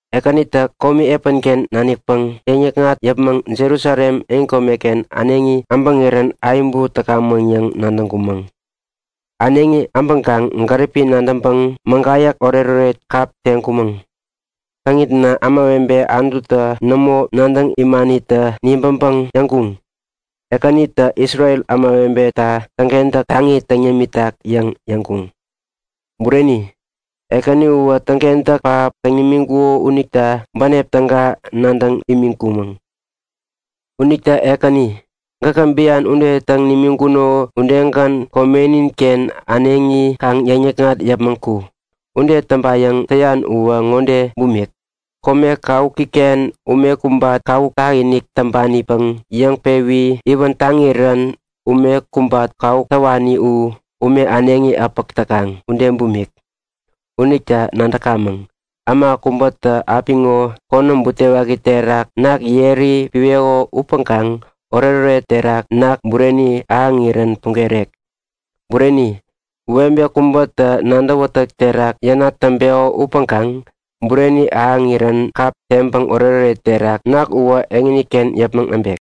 Ekänitä komi epänken nanikpäŋ yäŋnikŋat yäpmäŋ Jerusalem yotpärareken äneŋi äbäŋirän ayäbu täkamäŋ yäŋ nadäŋkumäŋ. Äneŋi abäŋkaŋ gäripi nadäŋpäŋ mägayäk oretoret kap teŋkumäŋ. Täŋitna ämawebe Anututa nämo nadäŋ imanitä nibäŋpäŋ yäŋkuŋ; Ekäninitä Isrel ämawebeta täŋkentäk taŋi täŋ yämitak yäŋ yäŋkuŋ. Bureni, Ekäni uwä täŋkentäk pähap täŋ nimiŋkuko unita bänep täga nadäŋ imiŋkumäŋ. Unita Ekäni, gäkä bian ude täŋ nimiŋkuno udegän komeninken äneŋi kaŋ yäŋnikŋat yäpmäŋ ku! Ude täŋpayäŋ täyan uwä ŋode bumik; Kome kawukiken ume kubat kawuk tak-inik täŋpanipäŋ yäŋpewi iwän taŋirän kubat kawuk täwani u ume äneŋi äpäk täkaŋ ude bumik. Unita nadäkamäŋ; Äma kubätä apiŋo konäm butewaki terak ketem yeri piweko upäŋkaŋ oretoret terak ketem bureni ahäŋirän pugerek. Bureni, webe kubätä nadäwätäk terak yänat täŋpeko upäŋkaŋ bureni ahäŋirän kap teŋpäŋ oretoret terak ketem uwä eŋiken yäpmäŋ äbek.